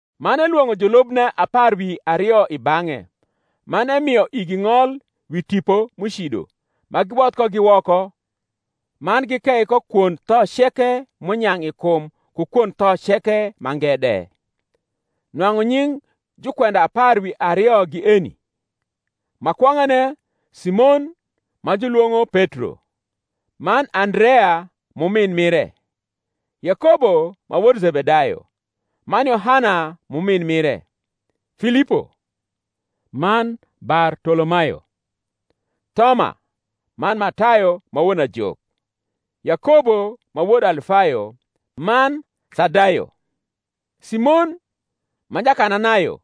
Man elwong’o julubne apar wi ario i bang’e, man emio igi ng’ol wi tipo m’ucido, ma giwodh kogi woko, man gikei ko kwond tho ceke m’unyang’ i kum ku kwond tho ceke mange de. Nwang’u nying’ jukwenda apar wi ario gi eni: Ma kwong’ane, Simon, ma julwong’o Petro, man Andrea m’umin mire; Yakobo ma wod Zebedayo, man Yohana m’umin mire; Filipo, man Bartolomayo; Thoma, man Matayo ma won ajok: Yakobo ma wod Alfayo, man Thadayo; Simon ma Jakananayo,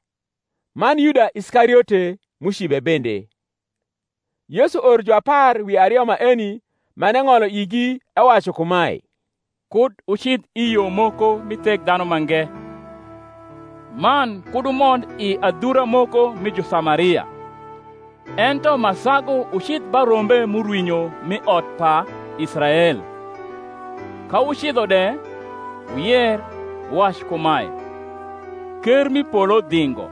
man Yuda Iskariote, m’ucibe bende. Yesu oro juapar wi ario maeni, man eng’olo igi, ewacu kumae, Kud wucidh i yo moko mi Thekdhanumange, man kud wumond i adhura moko nii Jusamaria: ento ma sagu wucidh ba rombe m’urwinyo m’i ot pa Israel. Ka wucidho de, wuyer, wuwac kumae, Ker m’i polo dhingo.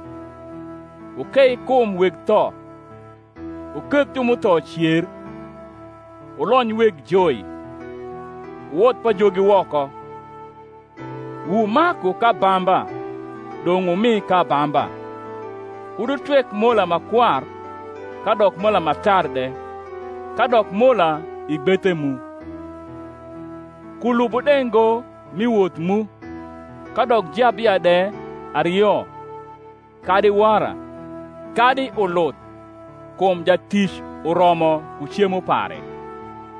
Wukei kum weg tho, wuketh ju m’utho cer, wulony weg joi, wuwodh pajogi woko: wumaku k’abamba, dong’ wumi k’abamba. Kud wutwek mola ma kwar, kadok mola ma tar de, kadok mola i gbethe mu: kulubu de ngo mi woth mu, kadok jabia de ario, kadi wara, kadi uluth; kum jatic uromo ku cemo pare.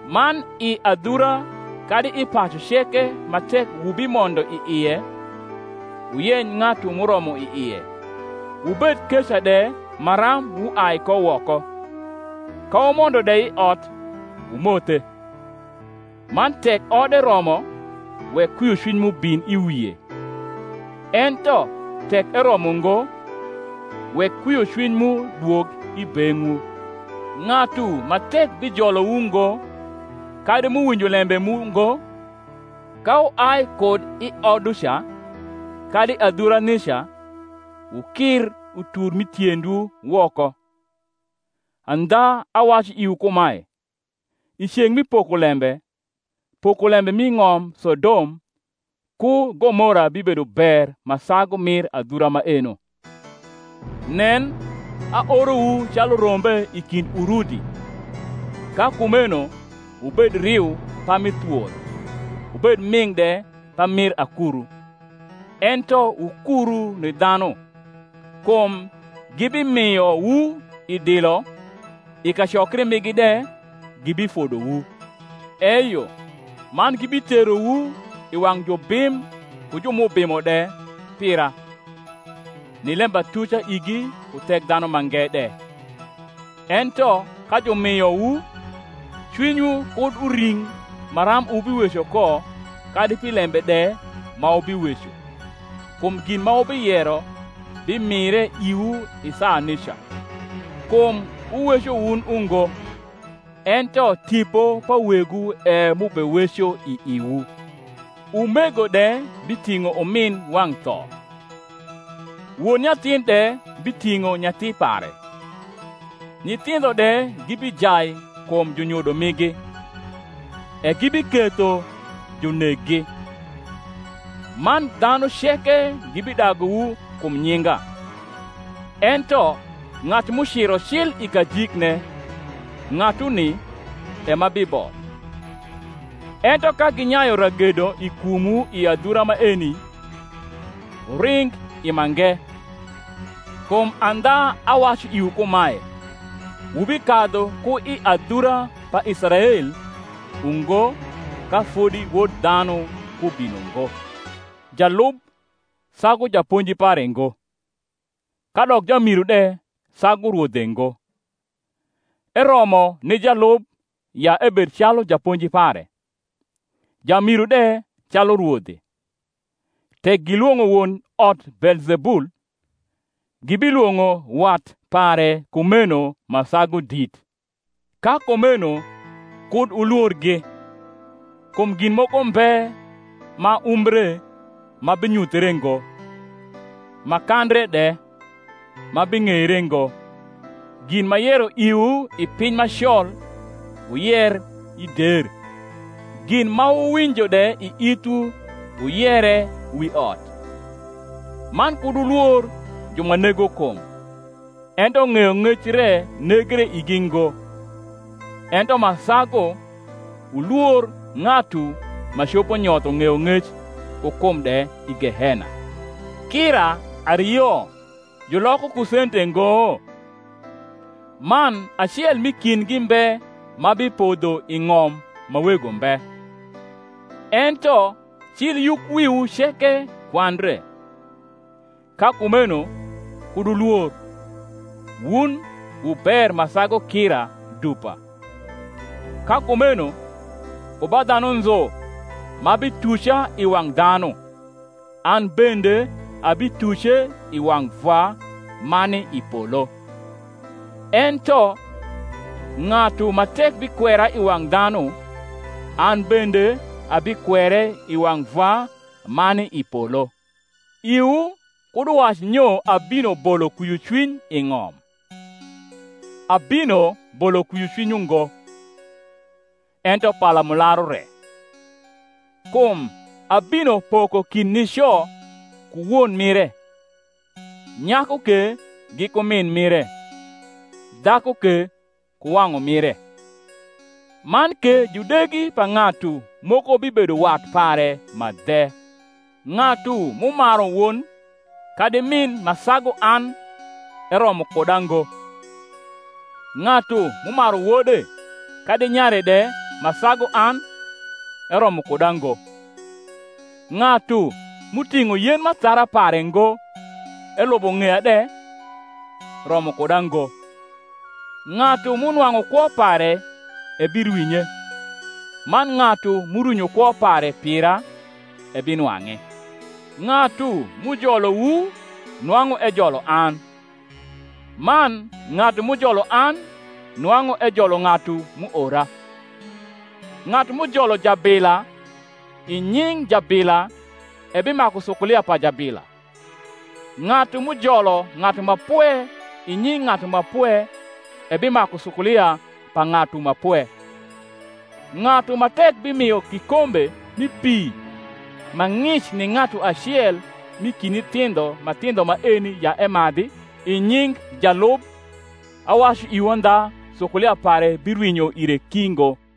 Man i adhura kadi i pacu ceke ma tek wubimondo i ie, wuyeny ng’atu m’uromo i ie; wubed keca de maram wuai ko woko. Ka wumondo de i ot, wumothe. Man tek ode romo, wek kwiocwiny mu bin i wie: ento tek eromo ngo, wek kwiocwiny mu dwog i beng’wu. Ng’atu ma tek bijolowu ngo, kadi m’uwinjo lembe mu ngo, ka wuai kud i oduca kadi adhura nica, wukir utur m’i tiendwu woko. Andha awacu iwu kumae, I ceng’ mi pokolembe, pokolembe mi ng’om Sodom ku Gomora bibedo ber ma sagu mir adhura maeno. Nen, aorowu calu rombe i kind urudi: ka kumeno wubed riu parni thwol, wubed ming’ de pamir akuru. Ento wukuru ni dhanu: kum gibimiowu i dilo, i kacokri migi de gibifodowu; eyo man gibiterowu i wang’ jubim ku ju m’ubimo de pira, ni lembatuca igi ku Thekdhanumange de. Ento ka jumiowu, cwinywu kud uring maram wubiweco ko kadi pi lembe de ma wubiweco: kum gin ma wubiyero bimire iwu i saa nica. Kum wuweco wun ungo, ento Tipo pa Wegwu e m’ubeweco i iwu. Umego de biting’o umin wang’ tho, won nyathin de biting’o nyathi pare: nyithindho de gibijai kum junyodo migi, e gibiketho juneggi. Man dhanu ceke gibidaguwu kum nyinga: ento ng’atu m’uciro cil i kajikne, ng’atuni e ma biboth. Ento ka ginyayu ragedo i kumwu i adhura maeni, wuring i mange: kum andha awacu iwu kumae, Wubikadhu ku i adhura pa Israel ungo, ka fodi Wod dhanu kubino ngo. Jalub sagu japonji pare ngo, kadok jamiru de sagu rwodhe ngo. Eromo ni jalub ya ebed calu japonji pare, jamiru de calu rwodhe. Tek gilwong’o won ot Beelzebul, gibilwong’o wat pare kumeno ma sagu dit! Ka kumeno kud wulworgi: kum gin moko mbe ma umbre, ma binyuthre ngo; ma kandre de, ma bing’eire ngo. Gin m’ayero iwu i piny ma col wuyer i der: gin ma wuwinjo de i ithwu, wuyere wi ot. Man kud wulwor ju ma nego kum, ento ng’eyong’ec re negre igi ngo: ento ma sagu wulwor ng’atu ma copo nyotho ng’eyong’ec ku kum de i gehena. Kira ario juloko ku sente ngo? man acel m’i kindgi mbe ma bipodho i ng’om ma Wego mbe: ento cil yukwiwu ceke kwandre. Ka kumeno kud wulwor: wun wu ber ma sagu kira dupa. Ka kumeno ku ba dhanu nzu ma bituca i wang’ dhanu, an bende abituce i wang’ Vwa ma ni i polo. Ento ng’atu ma tek bikwera i wang’ dhanu, an bende abikwere i wang’ Vwa ma ni i polo. Iwu kud uwac nyo abino bolo kwiocwiny i ng’om: abino bolo kwiocwiny ungo, ento palamularu re: Kum abino poko kind nico ku won mire, nyaku ke giku min mire, dhaku ke ku wang’umire: man ke judegi pa ng’atu moko bibedo wat pare ma dhe. Ng’atu m’umaru won kadi rnin ma sagu an eromo kuda ngo; ng’atu m’umaru wode kadi nyare de ma sagu an eromo kuda ngo. Ng’atu m’uting’o yen m’athara pare ngo elubo ng’eya de, romo kuda ngo. Ng’atu m’unwang’u kwo pare ebirwinye; man ng’atu m’urwinyo kwo pare pira ebinwang’e. Ng’atu m’ujolowu nwang’u ejolo an, man ng’atu m’ujolo an nwang’u ejolo ng’atu m’uora. Ng’atu m’ujolo jablia i nying’ jabila ebimaku sukulia pa jabila: ng’atu m’ujolo ng’atu ma pwe i nying’ ng’atu ma pwe ebimaku sukulia pa ng’atu ma pwe. Ng’atu ma tek bimio kikombe mi pi ma ng’ic ni ng’atu acel m’i kind nyithindho ma thindho maeni ya emadhi, i nying’ jalub, awacu iwu andha sukulia pare birwinyo ire ki ngo.